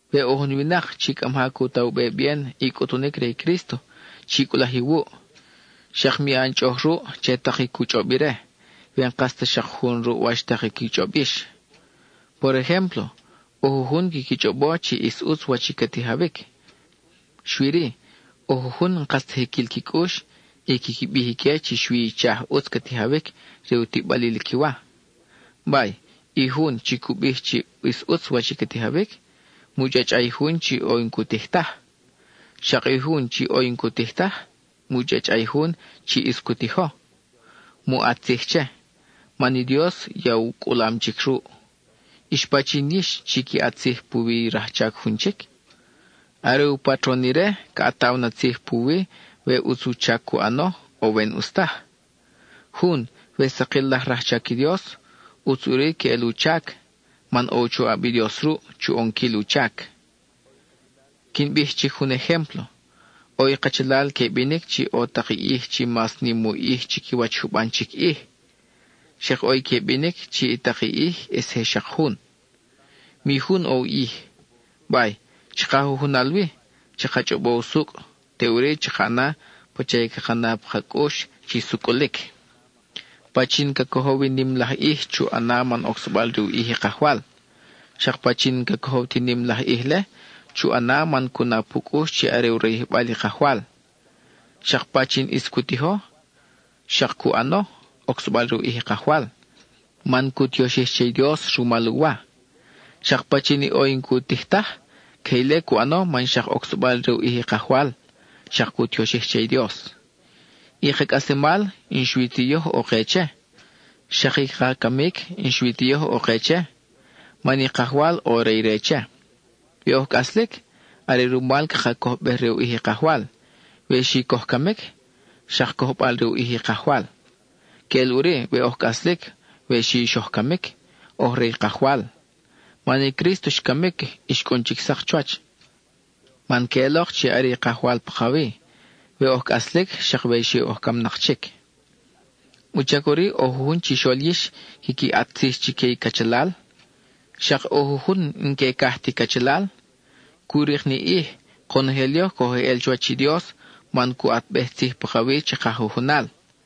We ʼo jun winak chi cʼa maja cu ta u be bien i cʼutunic re i Crísto, chi cʼulaj iwuʼ; xak mi ʼan chʼoʼoj ruʼ che tak i cu chʼob ire, we n-kas ta xak jun ruʼ wach i qui chʼob yix. Por ejémplo, ʼo jujun quiqui chʼobo chi ʼis ʼutz wach i ca tijawic, xui-ri, ʼo jujun n-kas ta jiquil qui cʼux y quiqui bij ique chi xui ichaj ʼutz ca tijawic re u tiʼbalil qui wa. Bay, i jun chi cu bij chi ʼis ʼutz wach ca tijawic, mu chʼachʼa i jun chi ʼo i n-cu tij taj. Xak i jun chi ʼo i n-cu tij taj, mu chʼachʼa i jun chi ʼis cu tijo. Mu ʼat tzij che, man i Dios ya u cʼulam chic ruʼ. ¿Ix pachin yix chi qui ʼat tzij puwi i rajchac jun chic? Are i u patron ire ca ʼataw na tzij puwi we ʼutz u chac cu ʼano o we n-ʼus taj. Jun, we sakil laj rajchac i Dios, ʼutz ʼuri queʼel u chac, man ʼo u choʼab i Dios ruʼ, chu ʼonquil u chac. Quin bij chic jun ejémplo: ʼo i kachalal que binic chi ʼo tak i ʼij chi mas nim u ʼij chiquiwach juban chic ʼij. Xak ʼo i que binic chi i tak i ʼij ʼis je xak jun, mi jun ʼo u ʼij. Bay, chaka jujunal wi, chaka chʼobo usucʼ, teʼuri chaka ʼana pacha i caka na pa ka cʼux chi sucʼulic. Pachin ca cojow i nim laj ʼij, chu ʼana man ocsabal re u ʼij i Kajwal. Xak pachin n-ca cojow ti nim laj ʼij-le, chu ʼana man cu na pu cʼux chi are u rayijbal i Kajwal. Xak pachin ʼis cu tijo, xak cu ʼano, ocsabal re u ʼij i Kajwal, man cu tioxij che i Dios rumal u wa. Xak pachin i ʼo i n-cu tij taj, queje ile cu ʼano man xak ocsabal re u ʼij i Kajwal; xak cu tioxij che i Dios. I ka cʼaslemal, n-xui ti yoj ʼo ke che; xak i ka camic, n-xui ti yoj ʼo ke che; man i Kajwal, ʼo re ire che. We oj cʼaslic, are rumal caka cojbej-re u ʼij i Kajwal; we xi coj camic, xak cojbal-re u ʼij i Kajwal. Queʼel ʼuri, we oj cʼaslic, we xi xoj camic, oj re i Kajwal. Man i Crísto xcamic, y xcʼun chic sak chuwach, man queʼelok chi are i Kajwal pakawi, we oj cʼaslic xak we xi oj camnak chic. ¿Wuchac ʼuri ʼo jujun chixol yix quiqui ʼat tzij chique i cachalal; xak ʼo jujun n-que caj ti cachalal? Cu rik ni ʼij, konojel yoj coj eʼel chuwach i Dios man cu ʼatbej tzij pakawi chaka jujunal.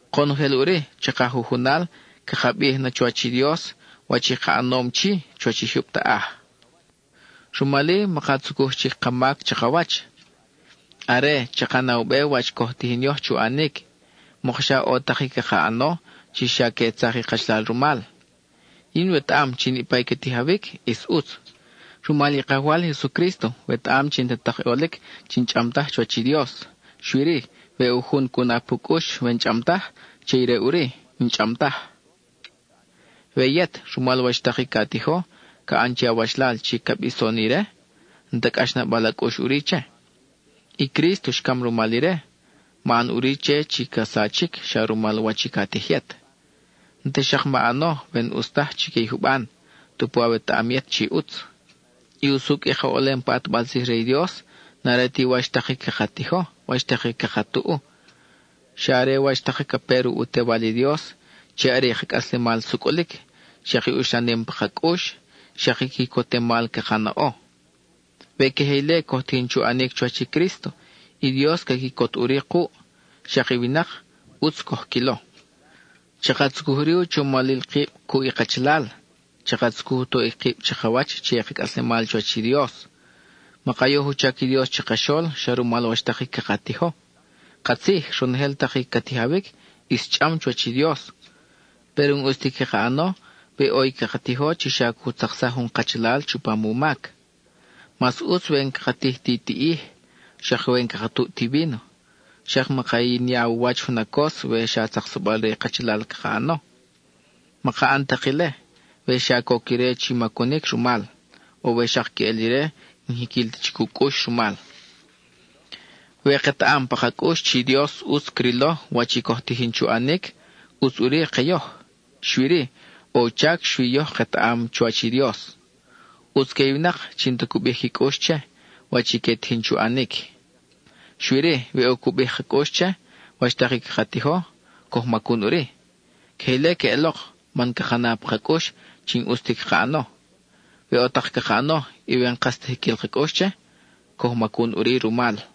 Konojel ʼuri, chaka jujunal, caka bij na chuwach i Dios, wach i ka ʼanom chi, chuwach i jyub taʼaj. Rumal-i, maka tzucuj chic ka mac chakawach. Are, chaka na u be wach coj tijin yoj chu ʼanic; mokxa ʼo tak i caka ʼano chi xa que tzak i kachalal rumal. Yin wetaʼam chi niʼpa i ca tijawic ʼis ʼutz; rumal i Kajwal Jesucrísto wetaʼam chi n-ta tak i ʼolic chi n-chʼam taj chuwach i Dios. Xui-ri, we ʼo jun cu na pu cʼux we n-chʼam taj, che ire ʼuri, n-chʼam taj. We yet, rumal wach tak i ca tijo, ca ʼan che awachalal chi ca bison ire, n-ta cʼaxnabal a cʼux ʼuri che. I Crísto xcam rumal ire; ma ʼan ʼuri che chi ca sachic xa rumal wach i ca tij yet. N-ta xak ma ʼano we n-ʼus taj chique i juban, tupu awetaʼam yet chi ʼutz. I usucʼ i ka ʼolem pa ʼatbal tzij re i Dios n-are ti wach tak i caka tijo, wach tak i caka tuʼu; xa are wach tak ca pe ruʼ u Tewal i Dios, chi are i ka cʼaslemal sucʼulic, xak i uxlanem pa ka cʼux, xak i quicotemal caka naʼo. We queje ile coj tijin chu ʼanic chuwach i Crísto, i Dios ca quicot ʼuri kuʼ; xak i winak, ʼutz coj quilo. Chaka tzucuj ʼuri u chomalil kib cuʼ i kachalal; chaka tzucuj u toʼic kib chakawach che i ka cʼaslemal chuwach i Dios. Maka yoj u chac i Dios chakaxol xa rumal wach tak i caka tijo. Katzij, ronojel tak i ca tijawic, ʼis chʼam chuwach i Dios, péro n-ʼus ti caka ʼano we ʼo i caka tijo chi xa cu tzaksaj jun kachalal chupam u mac. Mas ʼutz we n-caka tij ti tiʼij, xak we n-caka tuʼ ti víno, xak maka yinya u wach junacos we xa tzaksabal re i kachalal caka ʼano. Maka ʼan tak ile, we xa coc ire chi macunic rumal, o we xak queʼel ire n-jiquil ta chic u cʼux rumal. We ketaʼam pa ka cʼux chi Dios ʼutz crilo wach i coj tijin chu ʼanic, ʼutz ʼuri ke yoj, xui-ri, ʼo u chac xui yoj ketaʼam chuwach i Dios. ʼUtz que i winak chi n-ta cu bij qui cʼux che, wach i que tijin chu ʼanic. Xui-ri, we ʼo cu bij ka cʼux che, wach tak i caka tijo, coj macun ʼuri. Queje ile queʼelok, man caka na pa ka cʼux chi n-ʼus ti caka ʼano. We ʼo tak caka ʼano, y we n-kas ta jiquil ka cʼux che, coj macun ʼuri rumal.